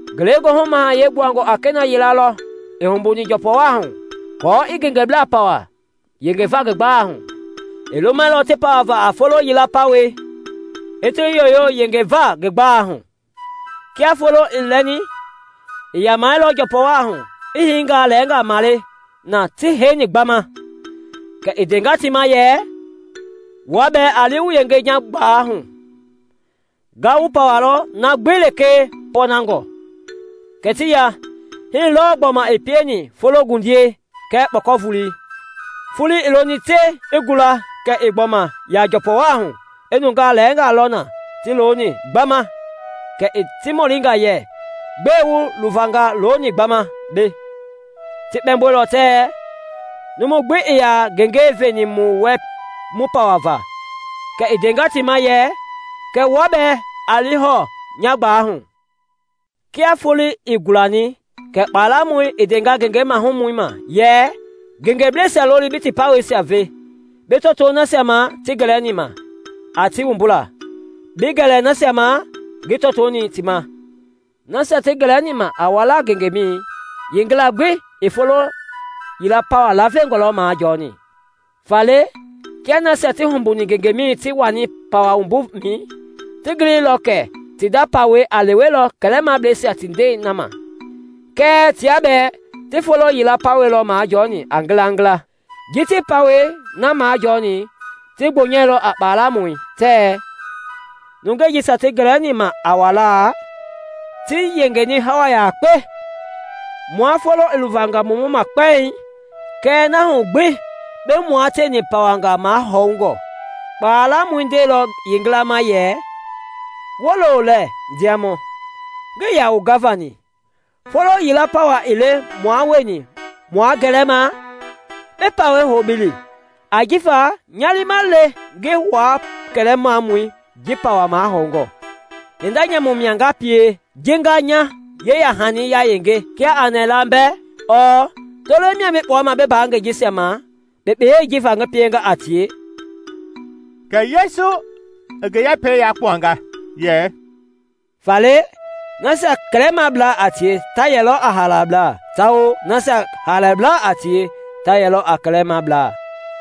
“Ngelegoohu Mahayɛi gbuangɔ a kena yila lɔ i humbuni njɔpɔwaahu aako i ngengeblaa pawa yengeva ngi gbalei hu. I lumɛilɔ ti pawava a folo yila pawɛi, i ti yoyo yengeva ngi gbalei hu. Kia foloi i lɛni, i yamɛilɔ njɔpɔwaahu, i hiingaa lɛɛnga male na ti heini gbama. Kɛ i ndenga ti ma yɛ, ‘Wua bɛɛ a li wu yenge nya gbalei hu. Nga wu pawalɔ a na gbi lekee pɔɔnangɔ.’ Kɛ ti ya. Hii lɔɔ i gbɔma pieni a fologundiɛi kɛɛ kpɔkɔvolei. Foloi i loni te i gula kɛ i gbɔma ya njɔpɔwaahu i nungaa lɛɛnga lɔ na ti looni gbama; kɛ i ti mɔlinga yɛ, ‘Gbɛe wu luvanga looni gbama mbei?’ Ti kpɛmboilɔ tɛɛ, ‘Numu gbi ii yaa ngenge veni mu wɛ mu pawava.’ Kɛ i ndenga ti ma yɛ, ‘Kɛ wua bɛɛ a li hɔɔ nya gbalei hu.’ “Kia foloi i gulani kɛ kpalamɔi i ndenga ngenge mahumɔi ma yɛ, ‘Ngengeblɛisia loli bi ti pawɛisia ve, bi tɔtoo nasia ma ngi gɛlɛni ma a ti wumbula, bi gɛlɛ nasia ma ngi tɔtoni ti ma.’ Nasia ti gɛlɛni ma a walaa ngengemɛi yeengila gbi i folo yila pawa lavengɔ lɔ majɔɔni. Faale kia nasia ti humbuni ngengemɛi ti wani pawa wumbumɛi, ti giliilɔ kɛ ti nda pawɛi a lewelɔ kɛlɛmableisia ti ndɛi na ma; kɛɛ tia bɛɛ ti folo yila pawɛi lɔ majɔɔni a ngilangila. Ji ti yeepawei na majɔɔni, ti gbonyɛilɔ a kpalamɔi tɛɛ, ‘Nungei jisia ti gɛlɛni ma a walaa ti yengeni hawa yakpe, mua foloi i luvanga mu mɔma kpɛiŋ kɛɛ na hu gbi bi mua tieni pawanga mahɔɔngɔ.’ Kpalamɔi ndeilɔ yeengila ma yɛ, ‘Wolo lɛɛ, ndiamɔ, ngii yaa wu gavani. Folo yila pawa ii le mua wueni mua gɛlɛma? Bi pawɛi hou bi li; ajifa nya liima le ngi wua kɛlɛmamɔi ji pawa mahɔɔngɔ. Hinda nyamu mia nga pie ji nga nya yeyahani yayenge kia a nɛɛla mbɛ? Ɔɔ tolei mia bi kpuama bi mbaa ngengeblɛi jisia ma kpekpei ji va ngi pienga a tie?’” Kɛ Yesu i ngi yɛpɛi yakpuanga yɛ, “Faale nasia kɛlɛmablaa a tie ta yɛlɔ a haalablaa tawao nasia haalablaa a tie ta yɛlɔ a kɛlɛmablaa.”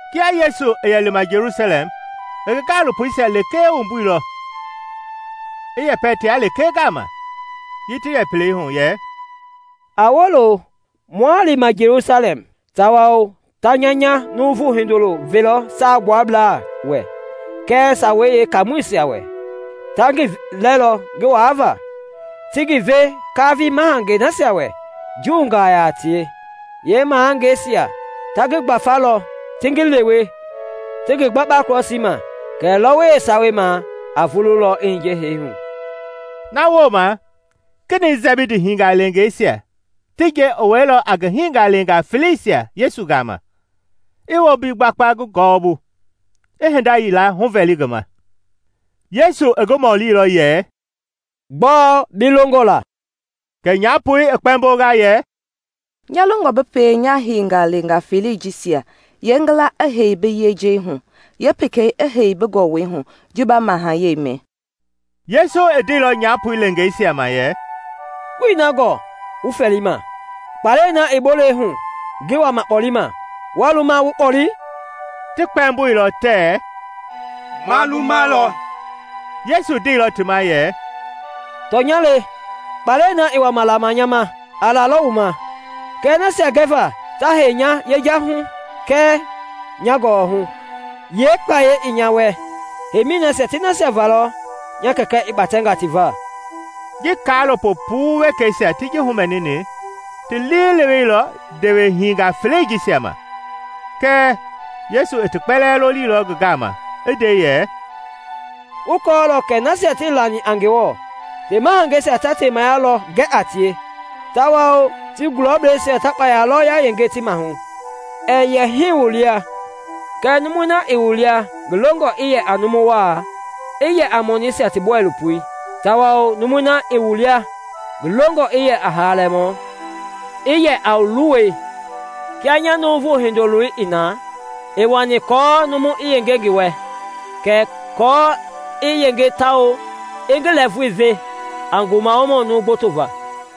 Kia Yesu i yɛ lima Jelusalɛm i ngi gaalopoisia lekee wumbuilɔ i yɛpɛ tia lekee gama ji ti yɛ pelei hu yɛ, “A wolo, mua lima Jelusalɛm tawao ta nya nya Numu Hindoloi velɔ Saagbuablaa wɛ kɛɛ Sawei Yeekaamɔisia. Ta ngi lɛɛlɔ ngi waavaa, ti ngi ve kaafii mahangei nasia wɛ Juungaa yaa a tie, yee mahangeisia ta ngi gbafa lɔ ti ngi lewe, ti ngi gbakpa krɔsii ma; kɛɛ lɔwɔi yeesawei ma a vululɔ i hiye hee hu.” Na wooma kenɛi Sɛbidi hingaleengeisia ti nje i wɛilɔ a ngi hingaleengaa feleisia Yesu gama, i wombi gbakpa ngi gɔwɔbu, i hinda yila huvɛli ngi ma. Yesu i ngi mɔlilɔ yɛ, “Gbɔɔ bi longɔ la” Kɛ nyaapoi i kpɛmbonga yɛ, “Nya longɔ bi pie nya hingaleengaa felei jisia yeengila i hei bi yejahui, yeepekei i hei bi gɔwɔhui ji ba mahayɛi mɛ.” Yesu i ndeilɔ nyapoi leengeisia ma yɛ, “Wuii na gɔɔ wu fɛɛlima. Kpalɛi na i bolei hu ngi wama kpɔlima waa lumalɔ wu kpɔle?” Ti kpɛmboilɔ tɛɛ, “Ma lumalɔ.” Yesu ndeilɔ ti ma yɛ, “Tɔnya le, kpalɛi na i wama lama nya ma a lalɔ wu ma, kɛɛ nasia gɛva ta hei nya yejahui kɛɛ nya gɔwɔhui, yeekpayei ii nya wɛ. Heimi nasia ti nasia va lɔ nya Kɛkɛ i kpatɛnga ti va.” Ji kaalopo puu wekeisia ti ji humɛnini ti liileweilɔ ndewehinga felei jisia ma. Kɛɛ Yesu i ti kpɛlɛɛ lolilɔ ngi gama, i nde yɛ, “Wu kɔɔlɔ kɛ nasia tii lani a Ngewɔ ti mahangeisia ta temaya lɔ gɛ a tie tawao ti gulɔbleisia ta kpayei lɔ yayenge ti maahu. Ɛɛ yɛ hii wu lia; kɛɛ numui na i wu lia ngi longɔ i yɛ a numu waa, i yɛ a yeemɔniisia ti bɔilopoi; tawao numui i wu lia ngi longɔ i yɛ a haalamɔ, i yɛ a wu luwɔi; kia nya Numu Hindoloi i na, ii wani aako numu i yenge ngi wɛ kɛɛ aako i yenge tawao i ngi lɛɛvui ve a ngumawohani numu gboto va.”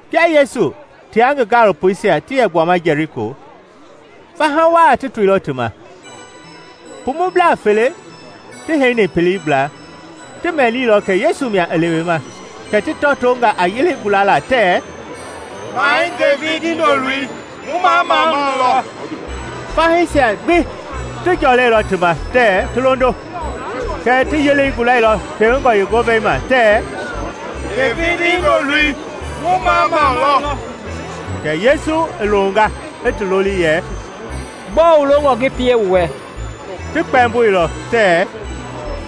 Kia Yesu tia ngi gaalopoisia ti yɛ gbuama Jɛliko, faha waa ti toilɔ ti ma. Pumublaa fele, ti heini pelei gbla, ti mɛnilɔ kɛ Yesu mia i lewema kɛ ti tɔtonga a yelei gulala tɛɛ, “Mahɛi Devidi Hindoloi! Mu mamamau lɔ!” Fahii ti jɔlɛilɔ ti ma tɛɛ ti londo. Kɛɛ ti yelei gulailɔ tewengɔ na ma tɛɛ, “Devidi Hindoloi! Mu mamamau lɔ!” Kɛ Yesu i longa i ti loli yɛ, “Gbɔɔ wu longɔ ngi pie wu wɛ?” Ti kpɛmboilɔ tɛɛ,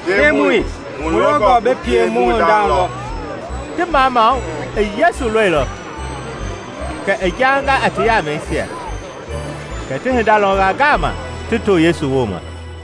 “Ndemɔi, mu longɔ bi pie mu hinda lɔ.” Ti mamamau i Yesu lɔilɔ, kɛ i jaanga a ti yamɛisia; kɛ ti hinda lɔnga ngaama, ti to Yesu ma.